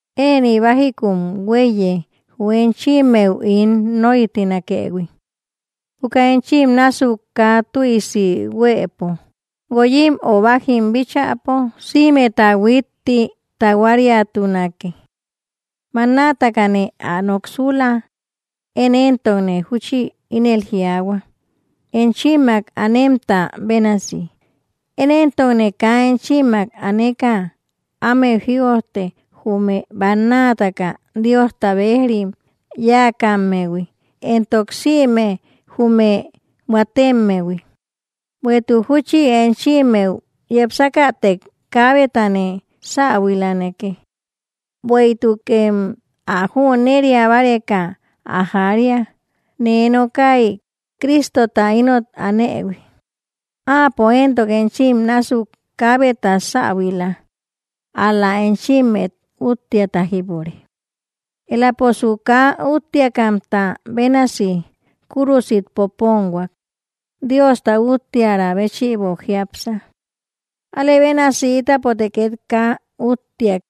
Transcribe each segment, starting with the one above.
Ëni bajikun hueíye jü enchimmeu ín noitinakëhui. Juka enchim násuk kaa tüisi huëpo, guoyim o bajim bíchäpo sïmeta huitti tahuariatunake. Bannatakane ä noksula, én entokne júchi ínel jiaahua enchimmak anemta bénasi, én entokne kaa enchimmak aneka ámeu jïojte jume bannataka Diosta bejrim yáakammehui, entok sïme jume huatemmehui, bueïtuk júchi enchimmeu yepsakätek kaabetane säbuilanake. Bueïtukem ä jüneria báareka ä jaria, nee nokay Cristota inot anëhui, áapo entok enchim násuk kaabeta säbuila, ál‑la enchimmet uttiata jípure. Eläposu kaa úttiakamta bénasi kúrusit poponhuak, Diosta utteara béchïbo jiápsa. Alëbénasi ítapote ket kaa úutiak,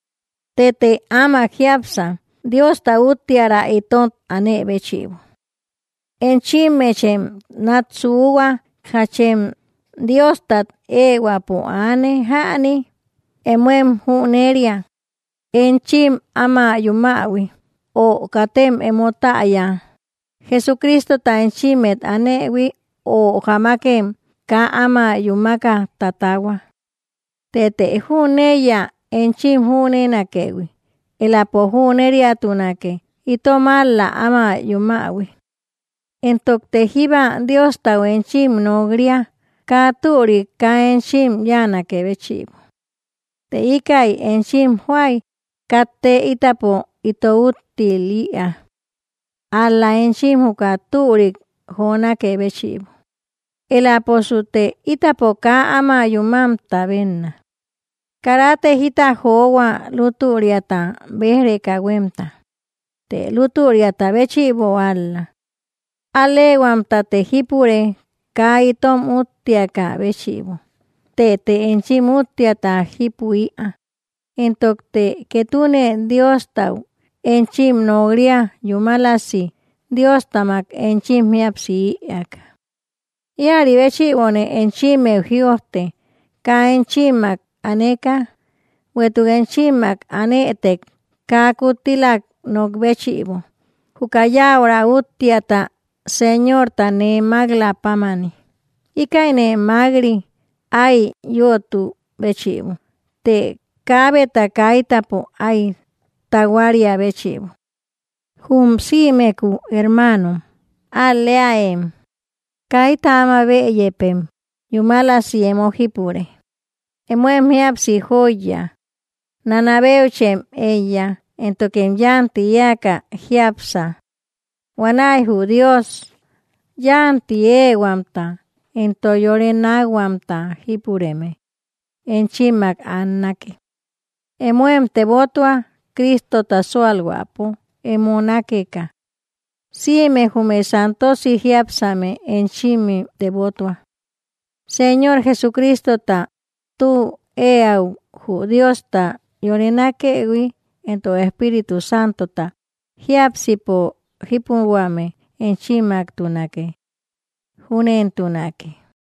tëte ámak jiápsa Diosta utteara itot anë béchïbo. Enchimechem nat suhua, jachem Diostat ehuäpo aane jäni; emoem jüneria enchim áma yumähui. ¿Ö katem emo täya, Jesucristota enchimmet anëhui, ö jamakem kaa áma yúmaka tatahua? Tëte jüneiya enchim jünenakëhui, elapo júneriatunake itom ál‑la ama yumähui. Entokte jíba Diostau enchim nok‑ria, kaa türik kaa enchim yanake béchïbo; të íkäi enchim joay katte itapo ito úttil‑ïa. Ál‑la enchim juka türik jonákë béchïbo, eläposute itapo kaa áma yumamta benna. Karate jita johua lútüriata bej‑reka huemta, të lútüriata béchïbo ál‑la. Al‑lehuamtate jípure kaa itom uttiaka béchïbo, tëte enchim úttiata jipu‑ïa, entokte ketune Diostau enchim nok‑ria yúmalasi Diostamak enchim jíapsi‑ïaka. Ïari béchïbone enchimmeu jïojte kaa enchimmak aneka, bueïtuk enchimmak anëtek kaa kuttilak nok béchïbo, juka yaura uttiata Señorta nee mak‑la pámani, íkäine mak‑ri ái yötu béchïbo, të kaabeta kaitäpo ái tahuaria béchïbo. Jum sïmeku hermanon, ál‑leaëm, kayta áma bëyepem yúmalasi emo jipure, emoem jíapsi joiya, nanabeuchem eíya, éntokem yanti eäka jiápsa; huanäi jü Dios yanti ehuamta entok yore nakhuamta jípureme, enchimmak annake. Emóem tebotua Cristota sualhuäpo emo nakeka. Sïme jume santosi jiápsame enchimim tebotua. Señor Jesucristota tü eäu, jü Diosta yore nakëhui, entok Espíritu Santota jiápsipo jipuhuame, enchimmaktunake. Júnentunake.